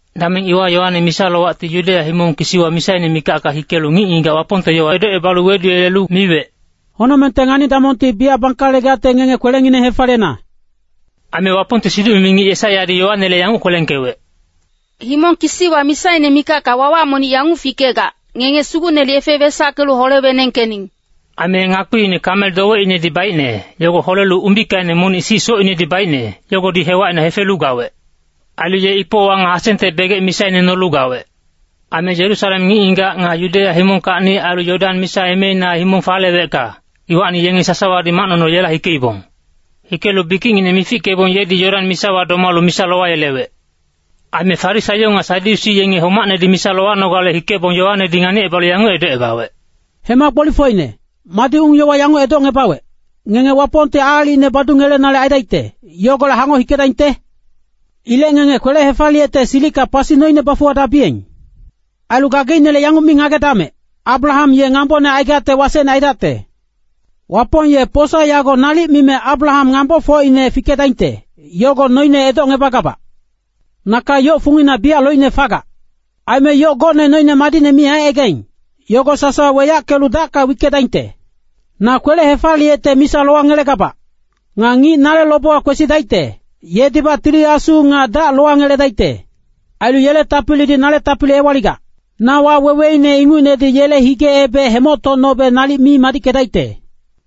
Dameng iwa Yoane misa-lowacti Yudeya himong kisiwa misaine mikacka hikelu ngic-ngigac Wapongte yowa edocebalu weduyelelu miwec, “Honocmengte ngani-damongti biyac bangkalegacte ngenge kwelengineng hefaliyena.” Aime Wapongte siduc-mimi ngic Yesaiyadi Yoanele yanguc kwelengkewec, “Himong kisiwa misaine mikacka wawac monic yanguc fikegac, ‘Ngenge Sugucnele yefe wesackelu hole-wenengkening.’” Aime ye ngakpiine kamel dowecinedi baicne, yogo holelu umbikaine monic sic socinedi baicne, yogodi hewacina hefelu gawec. Ailu ye ipowa nga hasengte begec misaine nolu gawec. Aime Yerusalem ngic-ngigac nga Yudeya himongkacni ailu Yodan misa emeina himong falewecka, iwacni yenge sasawadi macnono yela hikeibong. Hikelu bikicngineng mifickebong yedi Yodan misawa domalu misa lowayelewec. Aime Farisaio nga Sadyusi yenge homacnedi misa lowanogale hikebong Yoanedi nganicebalu yanguc edocebawec, “Hema gbolifocine, madi ung-yowa yanguc edocngebawec, ngenge Wapongti aalicine badungelenale aidaicte, yogolec hangoc hikedaingte? Ilec ngenge kwele-hefaliyecte silicka pasi noine bafuwadabiyeng. Ailu gageicnele yanguc mi ngagedamec, ‘Abraham ye ngambone aigacte wasecne aidacte.’ Wapong ye posa yago nalic mime Abraham ngambofocine fikedaingte, yogo noine edocngebagabac. “Naka yoc fungina biyac loicne fagac. Aime yoc gocne noine madicne mi aicaigaing, yogo sasawa weyackelu dacka wickedaingte. Na kwele-hefaliyecte misa lowangelegabac. Nga ngic nale lobewa kwesidaicte, yedibac Tili Asu nga dac lowangeledaicte. Ailu yele tapilidi nale tapili ewaligac. Na waweweine ingucnedi yele hige-ebec hemoctocnobe nalic mi madickedaicte.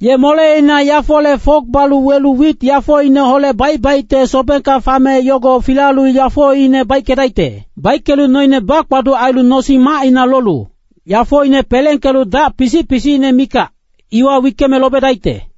Ye moleina yafole fok balu welelu wit yafoineholec baic-baicte sobengka fame yogo filalu yafoine baickedaicte. Baickelu noine bakpaduc ailu nosing-macina lolu, yafoine pelengkelu dac pisic-pisicine mikac, iwa wickeme lobedaicte.”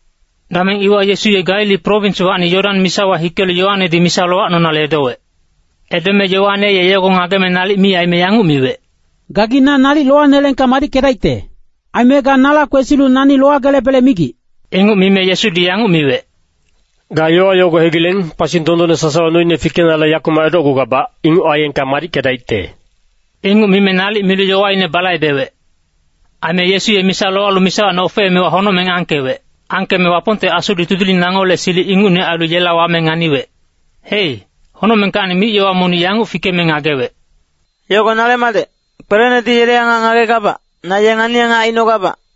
Dameng iwa Yesu ye Galili prowinswacni Yodan misawa hikelu Yoanedi misa lowacnonale edowec. Edome Yoane ye yogo ngageme nalic mi aime yanguc miwec, “Gagi na nalic lowaneleengka madickedaicte. Aime ga nala kwesilu nani lowagelebele migic.” Inguc mime Yesudi yanguc miwec, “Ga yowa yogo hegileng, pasi dondonne sasawa noine fikenale yakumac edocgugabac, inguc aiyengka madickedaicte.” Inguc mime nalic milu yowaine balaibewec. Aime Yesu ye misa lowalu misawacni ofeemewa honocmeng angkewec. Angkeme Wapongte Asudi tudiling nangole silic ingucne ailu yela wame nganiwec. Hei, honocmengkacni mic-yowa monic yanguc fikeme ngagewec, “Yogo nale madec, kwelenedi yele angac ngagegabac, na ye ngani-angac aicnogabac.”